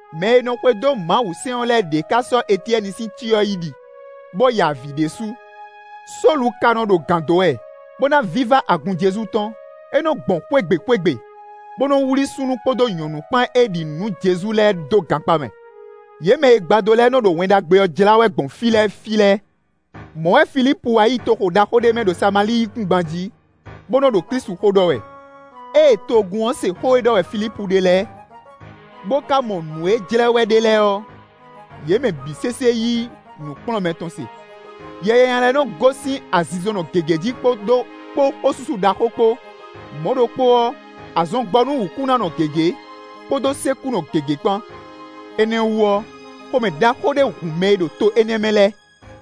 Mɛ e nɔ xwedó Mawusɛ́n ɔ́ lɛ́ɛ ɖěe ká sɔ́ Etyɛ́ni sín cyɔ yi ɖi, bó ya avǐ ɖésú. Sólu ka nɔ́ ɖo gǎn dó wɛ, bó ná vívá agun Jezu tɔn. É nɔ gbɔn xwé gbe xwé gbe, bó nɔ́ wlí súnnu kpódó nyɔ̌nu kpán e ɖi nǔ nú Jezu lɛ́ɛ dó gankpá mɛ. Yě mɛ e gbadó lɛ́ɛ nɔ́ ɖo Wɛn Ɖagbe ɔ́ jlá wɛ gbɔn fí lɛ́ɛ fí lɛ́ɛ. Mɔ̌ wɛ Filípu wá yi toxo ɖaxó ɖé mɛ ɖo Samalíi yíkúngban jí, bó nɔ́ ɖo Klísu xó ɖɔ wɛ. Ée togun ɔ́ se xó e ɖɔ wɛ Filípu ɖe lɛ́ɛ, bó ká mɔ nǔ e jlɛ́ wɛ é ɖe lɛ́ɛ ɔ́, yě mɛ bǐ sésé yí nǔkplɔ́nmɛ tɔn se. Yɛ nyanya lɛ́ɛ nɔ gosín azinzɔnnɔ gěgé jí kpó xósúsú ɖaxó kpó; mɔ̌ ɖokpó ɔ́, azɔn gbɔ nú wǔkúnánɔ gěgé, kpódó sékúnɔ gěgé kpán. Énɛ́ ɔ́ wú ɔ́, xomɛ ɖaxó ɖé hun mɛ e ɖo to énɛ́ mɛ lɛ́ɛ.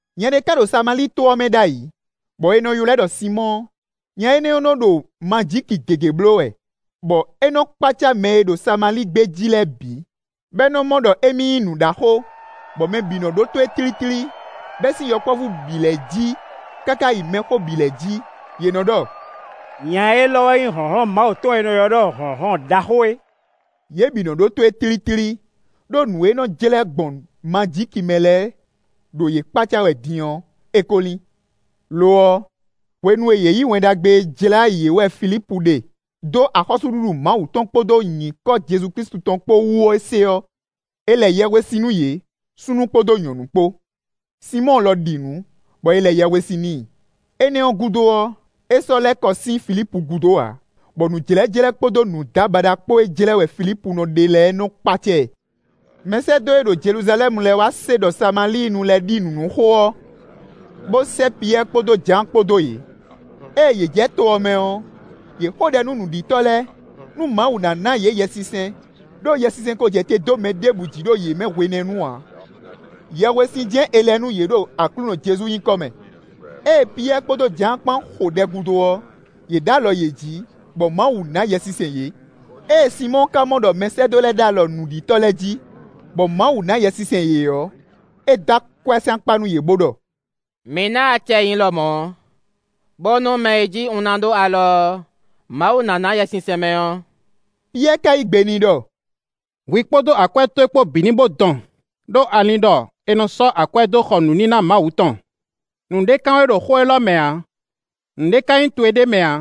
Nya ɖé ká ɖo Samalíi to ɔ́ mɛ ɖ'ayǐ, bɔ è nɔ ylɔ́ ɛ ɖɔ Sinmɔ́ɔ; nya énɛ́ nɔ́ ɖo majíki gěgé bló wɛ, bɔ é nɔ́ kpácá mɛ e ɖo Samalíi gbé jí lɛ́ɛ bǐ, bɔ é nɔ́ mɔ ɖɔ émí nyí nǔɖaxó, bɔ mɛ bǐ nɔ́ ɖótó e tlítlí, bɛ́ sín yɔkpɔ́vú bǐ lɛ́ɛ jí, káká yi mɛxó bǐ lɛ́ɛ jí; yě nɔ ɖɔ: “Nya élɔ́ wɛ nyí hlɔ̌nhlɔ́n Mawu tɔn e è nɔ ylɔ́ ɖɔ ‘hlɔ̌nhlɔ́n ɖaxó’ é.” Yě bǐ nɔ́ ɖótó e tlítlí, ɖó nǔ e é nɔ́ jlɛ́ gbɔn majíki mɛ lɛ́ɛ ɖo yě kpácá wɛ din ɔ́, é kó lín. Lo ɔ́, hwenu e yě yǐ Wɛn Ɖagbe e jlá yě wɛ Filípu ɖe dó axɔ́súɖuɖu Mawu tɔn kpódó nyǐkɔ Jezu Klísu tɔn kpó wú ɔ́ se ɔ́, è lɛ yɛhwesin nú yě, súnnu kpódó nyɔ̌nu kpó. Sinmɔ́ɔ lɔ ɖi nǔ, bɔ è lɛ yɛhwesin n'i; énɛ́ ɔ́ gúdo ɔ́, é sɔ́ lɛ́ kɔ sín Filípu gúdo ǎ, bɔ nǔjlɛ́jlɛ́ kpódó nǔdábaɖa kpó e jlɛ́ wɛ Filípu nɔ ɖe lɛ́ɛ nɔ́ kpácá ɛ. Mɛsɛ́dó e ɖo Jeluzalɛ́mu lɛ́ɛ wá se ɖɔ Samalíinu lɛ́ɛ ɖi nǔ nú xó ɔ́, bó sɛ́ Piyɛ́ɛ kpódó Jǎan kpán dó yě. Ée yě jɛ to ɔ́ mɛ ɔ́, yě xo ɖɛ nú nǔɖitɔ́ lɛ́ɛ, nú Mawu ná ná yě Yɛsinsɛn; ɖó Yɛsinsɛn ko jɛ te dó mɛ ɖěbǔ jí ɖo yě mɛ hwenɛ́nu ǎ; yɛhwesin jɛ́n è lɛ nú yě ɖo Aklúnɔ Jezu nyíkɔ mɛ. Ée Piyɛ́ɛ kpódó Jǎan kpán xo ɖɛ gúdo ɔ́, yě ɖó alɔ yě jí, bɔ Mawu ná Yɛsinsɛn yě. Ée Sinmɔ́ɔ ka mɔ ɖɔ mɛsɛ́dó lɛ́ɛ ɖó alɔ nǔɖitɔ́ lɛ́ɛ jí, bɔ Mawu ná Yɛsinsɛn yě ɔ́, é dó akwɛ́ sín akpá nú yě, bó ɖɔ: “Mi ná acɛ nyi lɔmɔ̌, bónú mɛ e jí un ná ɖó alɔ ɔ́, Mawu ná ná Yɛsinsɛn mɛ ɔ́.” Piyɛ́ɛ ka yí gbe n'i ɖɔ: “Hwi kpódó akwɛ́ towe kpó bǐ ní bó dɔn, ɖó a lin ɖɔ è nɔ sɔ́ akwɛ́ dó xɔ nǔníná Mawu tɔn. Nǔɖé kan we ɖo xó élɔ́ mɛ ǎ; nǔɖé ka nyí towe ɖ'é mɛ ǎ;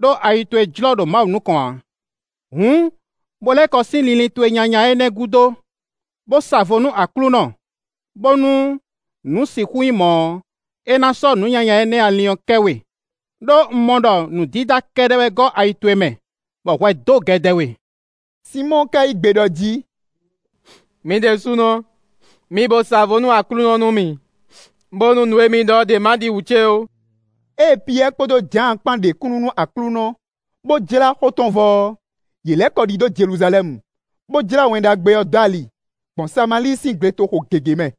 ɖó ayi towe jlɔ́ ɖo Mawu nukɔn ǎ. Hǔn, bo lɛ́ kɔ sín linlin towe nyanya énɛ́ gúdo, bó sa vo nú Aklúnɔ, bónú nǔ sixú nyí mɔ̌ ɔ́, é ná sɔ́ nǔ nyanya énɛ́ e a lin ɔ́ kɛ we; ɖó un mɔ ɖɔ nǔ dídá kɛ́ɖɛ́ wɛ gɔ́ ayi towe mɛ, bɔ hwɛ dó gɛdɛ we.” Sinmɔ́ɔ ka yí gbe ɖɔ jí: “Mi ɖésúnɔ mi bo sa vo nú Aklúnɔ nú mì, bónú nǔ e mi ɖɔ ɔ́ ɖě ma ɖi wǔ ce ó.” Ée Piyɛ́ɛ kpódó Jǎan kpán ɖe kúnnu nú Aklúnɔ, bó jlá xó tɔn vɔ ɔ́, yě lɛ́ kɔ ɖidó Jeluzalɛ́mu, bó jlá Wɛn Ɖagbe ɔ́ dó ali, gbɔn Samalíi sín gletoxo gěgé mɛ.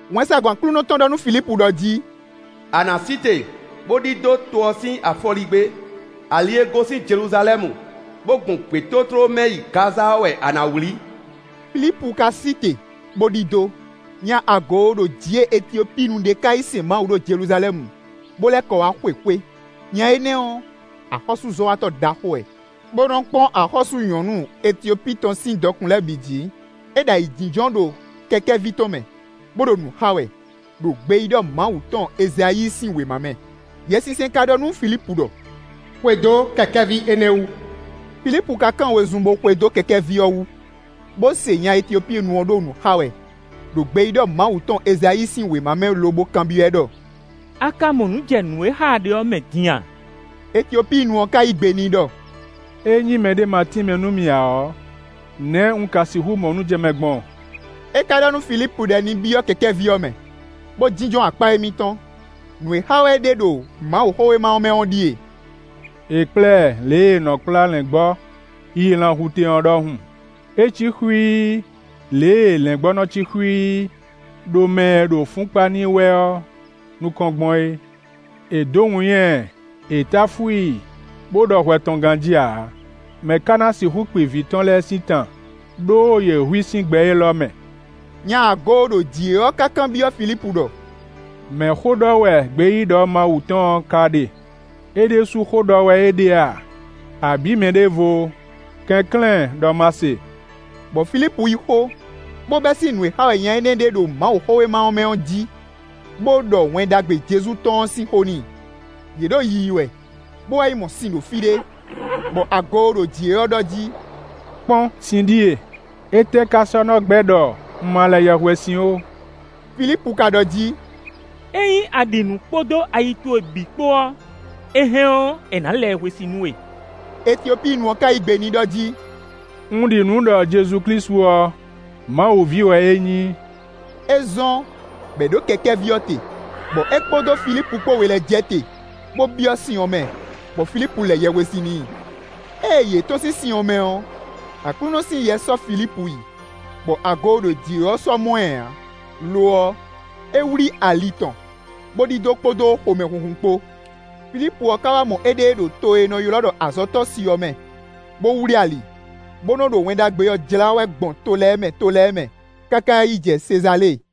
Wɛnsagun Aklúnɔ tɔn ɖɔ nú Filípu ɖɔ jí: “A nǎ sí te, bó ɖidó to ɔ́ sín afɔligbé. Ali e gosín Jeluzalɛ́mu, bó gbɔn gbětótló mɛ yi Gaza ɔ́ wɛ a nǎ wlí.” Filípu ka sí te, bó ɖidó. Nya agooɖojǐe Etiopíinu ɖé ka yi sɛn Mawu ɖo Jeluzalɛ́mu, bó lɛ́ kɔ wá xwe xwé. Nya énɛ́ ɔ́, axɔ́súzɔ́watɔ́ ɖaxó wɛ, bó nɔ́ kpɔ́n axɔ́sú nyɔ̌nu Etiopíi tɔn sín dɔkun lɛ́ɛ bǐ jǐ; é ɖo ayǐjínjɔ́n ɖo kɛkɛ́ví tɔn mɛ, bó ɖo nǔ xa wɛ, ɖo gbeyíɖɔ Mawu tɔn Ezayíi sín wěma mɛ. Yɛsinsɛn ka ɖɔ nú Filípu ɖɔ: “Xwedó kɛkɛ́ví énɛ́ wú.” Filípu ka kán wezun bó xwedó kɛkɛ́ví ɔ́ wú, bó se nya Etiopíinu ɔ́ ɖo nǔ xa wɛ, ɖo gbeyíɖɔ Mawu tɔn Ezayíi sín wěma mɛ lobo kanbyɔ́ ɛ ɖɔ: “A ka mɔ nǔ jɛ nǔ e xa wɛ a ɖe ɔ́ mɛ din a?” Etiopíinu ɔ́ ká yí gbe n'i ɖɔ: “Ényí mɛɖé má tínmɛ nú mì ǎ ɔ́, nɛ̌ un ka sixú mɔ nǔ jɛ mɛ gbɔn?” É ka ɖɔ nú Filípu ɖɔ ní byɔ́ kɛkɛ́ví ɔ́ mɛ, bó jínjɔ́n akpá émítɔn. Nǔ e xa wɛ é ɖe ɖo Mawuxówéma ɔ́ mɛ ɔ́ ɖíe: “È kplá ɛ lě e è nɔ kplá lɛ̌ngbɔ́ yi lanhutɛn ɔ́ ɖɔhun; é cí xwíí, lě e lɛ̌ngbɔ́ nɔ cí xwíí ɖo mɛ e ɖo fún kpa n'i wɛ ɔ́ nukɔn gbɔn é. È dǒ winnyá ɛ, è táfú i, bó ɖɔ hwɛ tɔn ganjí ǎ. Mɛ̌ ka ná sixú kpi vǐ tɔn lɛ́ɛ sín tan? Đó yě hu i sín gbɛ élɔ́ mɛ.” Nya agooɖojǐe ɔ́ ká kanbyɔ́ Filípu ɖɔ: “Mɛ̌ xó ɖɔ wɛ gbeyíɖɔ Mawu tɔn ɔ́ ká ɖe? É ɖésú xó ɖɔ wɛ é ɖe a, abǐ mɛ ɖěvo? Kɛnklɛ́n, ɖɔ má se.” Bɔ Filípu yí xó, bó bɛ́ sín nǔ e xa wɛ nya énɛ́ ɖe ɖo Mawuxówéma ɔ́ mɛ ɔ́ jí, bó ɖɔ Wɛn Ɖagbe Jezu tɔn ɔ́ sín xó n'i. Yě ɖo yiyi wɛ, bó wá yi mɔ sin ɖo fí ɖé, bɔ agooɖojǐe ɔ́ ɖɔ jí: “Kpɔ́n! Sin ɖíe; étɛ́ ka sɔ́ ná gbɛ́ ɖɔ un ma lɛ yɛhwesin ó?” [ Filípu ka ɖɔ jí: “Ényí a ɖi nǔ kpódó ayi towe bǐ kpó ɔ́, è hɛn ɔ́, è nǎ lɛ yɛhwesin nú we.” Etiopíinu ɔ́ ka yí gbe n'i ɖɔ jí: “Un ɖi nǔ ɖɔ Jezu Klísu ɔ́, Mawu ví wɛ é nyí.”] É zɔ́n bɔ è ɖǒ kɛkɛ́ví ɔ́ te, bɔ é kpódó Filípu kpó we lɛ́ɛ jɛ te, bó byɔ́ sin ɔ́ mɛ, bɔ Filípu lɛ yɛhwesin n'i. Ée yě tɔ́n sín sin ɔ́ mɛ ɔ́, Aklúnɔ sín Yɛ sɔ́ Filípu yi, bɔ agooɖojǐe ɔ́ sɔ́ mɔ ɛ ǎ. Lo ɔ́, é wlí ali tɔn, bó ɖidó kpódó xomɛhunhun kpó. Filípu ɔ́ ka wá mɔ éɖée ɖo to e è nɔ ylɔ́ ɖɔ Azɔtɔ́si ɔ́ mɛ, bó wlí ali, bó nɔ́ ɖo Wɛn Ɖagbe ɔ́ jlá wɛ gbɔn to lɛ́ɛ mɛ to lɛ́ɛ mɛ, káká yi jɛ Sezalée.